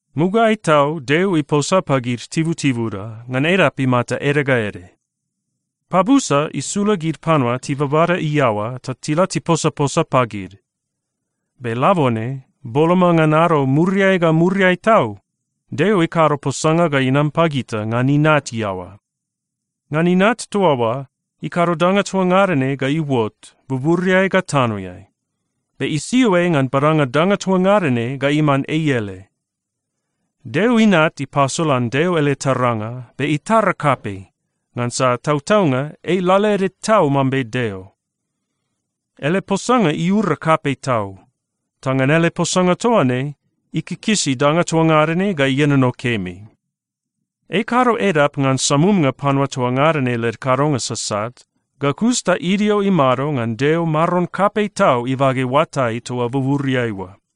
Mugaeai tau Deo iposa pagid tibutibuda ngan edap imata ede ga ede. Pabusa isula gid panua tibabada iaoa ta tila tiposaposa pagid. Be labone, boloma ngan ado muriai ga muriai tau, Deo ikado posanga ga inam pagita ngan Inat iaoa. Ngan Inat toa oa, ikado danga toa ngada ne ga iuot buburiai ga tanoeai. Be isio ei ngan badanga danga toa ngada ne ga iman ei ele. Deo Inat ipasolan Deo ele taranga, be itara kapei, ngansa tautaunga ei lalaede tau mambe Deo. Ele posanga iura kapei tau, ta ngan ele posanga toa ne ikikisi danga toa ngada ne ga ienono kemi. Ei ikado edap ngan samumnga panua toa ngada ne led kadonga sasat, ga kus ta idio imado ngan Deo Maron kapei tau ibage oatai toa buburiai oa.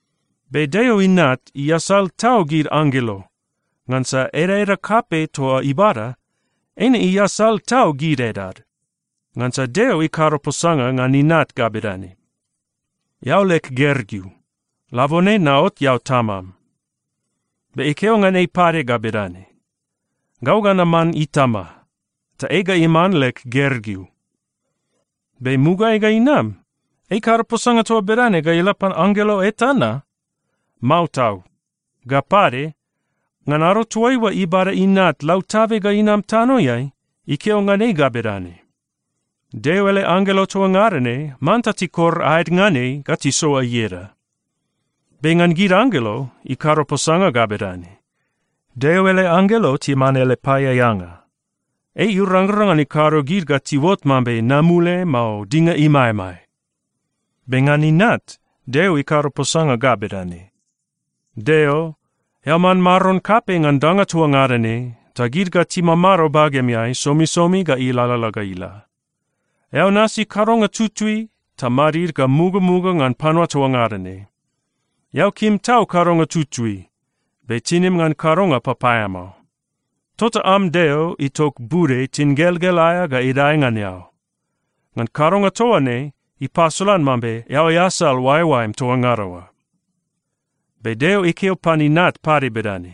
Be Deo Inat iasal tau gid anggelo, ngansa edaeda kapei toa ibada, eine iasal tau gid edad. Ngansa Deo ikado posanga ngan Inat ga bedane, “Eao leg Gergeu. Labone naot eao Tamam.” Be ikeo ngan ei pade ga bedane, “Gau ga naman Itama, ta ei ga iman leg Gergeu.” Be mugaeai ga inam, ei ikado posanga toa bedane ga ila pan anggelo eta na? Mao tau! Ga pade, ngan ado toaiua ibada Inat lautabe ga inam tanoeai, ikeo ngan ei ga bedane, “Deo ele anggelo toa ngada ne manta tikor aed ngan ei ga tisoa ieda.” Be ngan gid anggelo, ikado posanga ga bedane, “Deo ele anggelo timan ele paeaeanga. Ei irangrang ngan ikado gid ga tiuot mambe namule, mao dinga imaemae.” Be ngan Inat, Deo ikado posanga ga bedane, “Deo, eao man Maron kapei ngan danga toa ngada ne, ta gid ga timamado bagemeai somisomi ga ilalala ga ila. Eao nasi kadonga tutui ta madid ga mugamuga ngan panua toa ngada ne. Eao kim tau kadonga tutui, be tinim ngan kadonga papaeamao. Tota am Deo itok bude tingelgel aea ga idae ngan eao. Ngan kadonga toa ne, ipasolan mambe eao easal oaeoaem toa ngada oa.” Be Deo ikeo pan Inat pade bedane,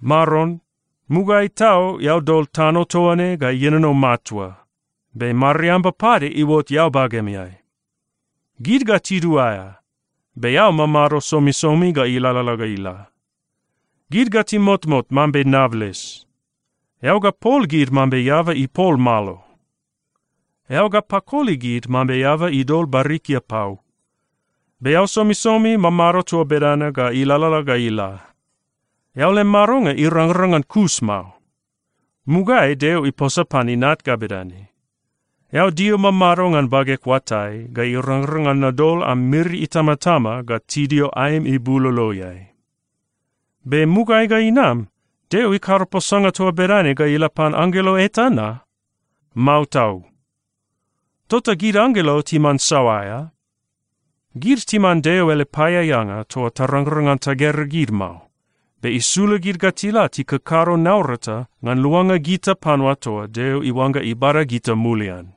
“Maron, mugaeai tau eao dol tano toa ne ga ienono matua, be mariamba pade iuot eao bagemeai. Gid ga tiduaea, be eao mamado somisomi ga ilalala ga ila. Gid ga timotmot mambe nables. Eao ga pol gid mambe eaba ipol malo. Eao ga pakoli gid mambe eaba idol barikia pau. Be eao somisomi mamado toa bedana ga ilalala ga ila. Eao lem madonga irangrang ngan kus mao.” Mugaeai Deo iposa pan Inat ga bedane, “Eao dio mamado ngan bageg oatai ga irangrang ngan nadol am miri itamatama ga tidio aem ibuloloeai.” Be mugaeai ga inam, Deo ikado posanga toa bedane ga ila pan anggelo eta na? Mao tau! Tota gid anggelo timan saoa aea? Gid timan Deo ele paeaeanga toa tarangrang ngan tagera gid mao, be isula gid ga tila tikakado naurata ngan luanga gita panua toa Deo iuangga ibada gita mulian.